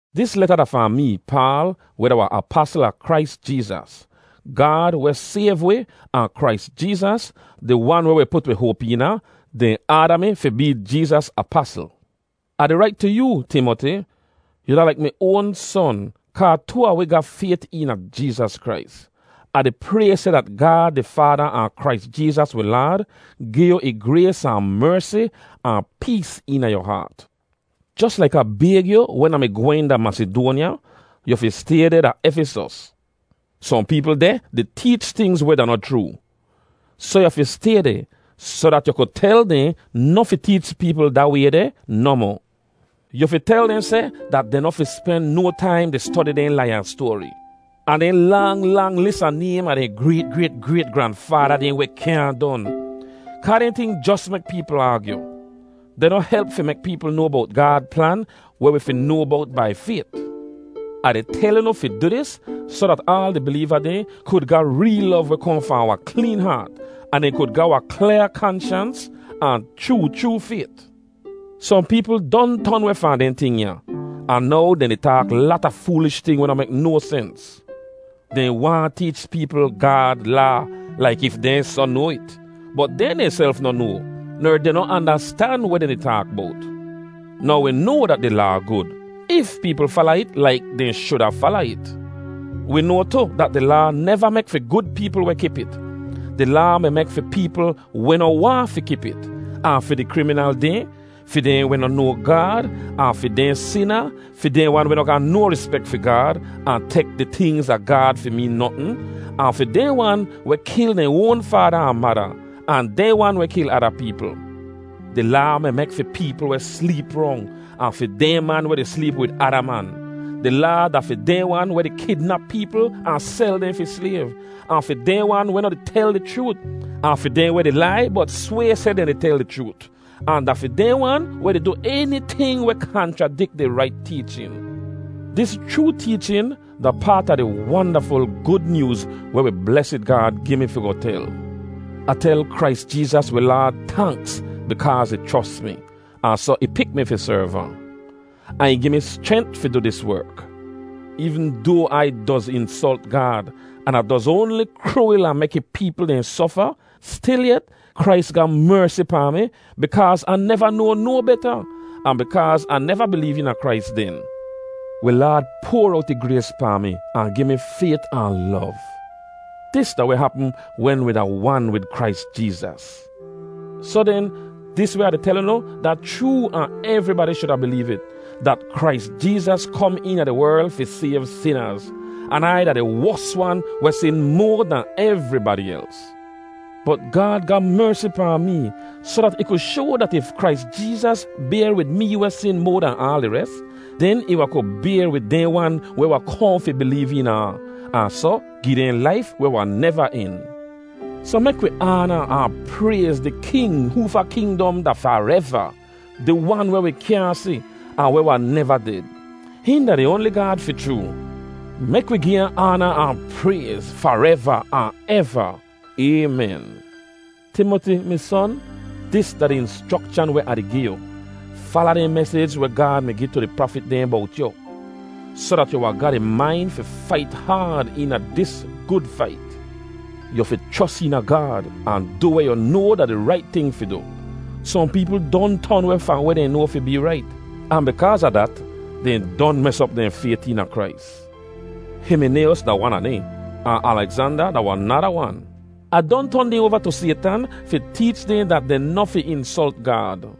Dis leta da fahn mee, Paal, weh da wahn apasl a Krais Jeezas. Gaad, weh sayv wi, ahn Krais Jeezas, di Wan weh wi put wi hoap eena, dehn aada mi fi bee Jeezas apasl. Ah di rait tu yoo, Timoti; yu da laik mi oan son, kaa too a wi ga fayt eena Jeezas Krais. Ah di pray seh dat Gaad di Faada ahn Krais Jeezas wi Laad gi yu ih grays ahn mersi ahn pees eena yu haat. Jos laik Ah bayg yu wen Ah mi gwehn da Masidoanya, yu fi stay deh da Efisos. Sohn peepl deh di teech tingz weh da noh chroo. Soh yu fi stay deh soh dat yu ku tel dehn noh fi teech peepl da way deh nohmoh. Yu fi tel dehn seh dat dehn noh fi spen no taim di stodi dehn lai-an-stoari, ahn dehn lang, lang lis a naym a dehn grayt-grayt-grayt-granfaada dehn weh kyaahn don. Kaa dehn ting deh jos mek peepl aagyu. Dehn noh help fi mek peepl noa bowt Gaad plan weh wi fi noa bowt bai fayt. Ah di tel unu fi du dis soh dat aal di bileeva dehn kud ga reel lov weh kohn fahn wahn kleen haat, ahn dehn kud ga wahn klyaa kanshans, ahn chroo chroo fayt. Sohn peepl don ton weh fahn dehn ting ya. Ahn now dehn di taak lata foolish ting weh noh mek no sens. Dehn waahn teech peepl Gaad Laa laik if dehn soh noa it, bot dehn dehnself noh noa, ner dehn noh andastan weh dehn di taak bowt. Now wi noa dat di Laa gud, if peepl fala it laik dehn shuda fala it. Wi noa tu dat di Laa neva mek fi gud peepl weh kip it. Di Laa mi mek fi peepl weh noh waahn fi kip it, ahn fi di kriminal dehn, fi dehn weh noh noa Gaad, ahn fi dehn sina, fi dehn wan weh noh ga no rispek fi Gaad ahn tek di tingz a Gaad fi meen notn, ahn fi dehn wan weh kil dehn oan faada ahn mada, ahn dehn wan weh kil ada peepl. Di Laa mi mek fi peepl weh sleep rong ahn fi dehn man weh di sleep wid ada man. Di Laa da fi dehn wan weh di kidnap peepl ahn sel dehn fi slayv, ahn fi dehn wan weh noh tel di chroot, ahn fi dehn weh di lai, bot sway seh dehn di tel di chroot. Ahn da fi dehn wan weh di du eniting weh kanchradik di rait teechin. Dis chroo teechin da paat a di wandaful Gud Nyooz weh wi blesid Gaad gi mi fi goh tel. Ah tel Krais Jeezas wi Laad tanks bikaaz ih chros mi, ahn soh ih pik mi fi serv ahn. Ahn ih gi mi schrent fi du dis werk. Eevn doa Ai doz insolt Gaad, an Ah doz oanli kruwil ahn mek ih peepl dehn sofa, stilyet, Krais ga mersi pahn mi bikaaz Ah neva noa no beta, ahn bikaaz Ah neva bileev eena Krais den. Wi Laad poar owt ih grays pahn mi ahn gi mi fayt ahn lov. Dis da weh hapm wen wi da wan wid Krais Jeezas. Soh den, dis weh Ah di tel unu da chroo ahn evribadi shuda bileev it, dat Krais Jeezas kom eena di werl fi sayv sinaz. An Ai da di wos wan weh sin moa dahn evribadi els. Bot Gaad ga mersi pahn mee soh dat ih ku shoa dat if Krais Jeezas bayr wid mee weh sin moa dahn aal di res, den ih wahn kud bayr wid dehn wan weh wahn kohn fi bileev eena ahn, ahn soh gi dehn laif weh wahn neva en. Soh mek wi aana ahn prayz di King hoofa kingdom da fareva, di Wan weh wi kyaahn si, ahn weh wahn neva ded. Hihn da di oanli Gaad fi chroo. Mek wi gi ahn aana ahn prayz, fareva ahn eva! Aymen. Timoti, mi son, dis da di inschrokshan weh Ah di gi yu: fala dehn mesij weh Gaad mi gi tu di prafit dehn bowt yu, soh dat yu wahn ga di main fi fait haad eena dis gud fait. Yu fi chros eena Gaad ahn du weh yu noa da di rait ting fi du. Sohn peepl don ton weh fahn weh dehn noa fi bee rait, ahn bikaaz a dat, dehn don mes op dehn fayt eena Krais. Himinayos da wan a dehn, ahn Alegzanda da wahn nada wan. Ah don ton dehn oava tu Saytan fi teech dehn dat dehn noh fi insolt Gaad.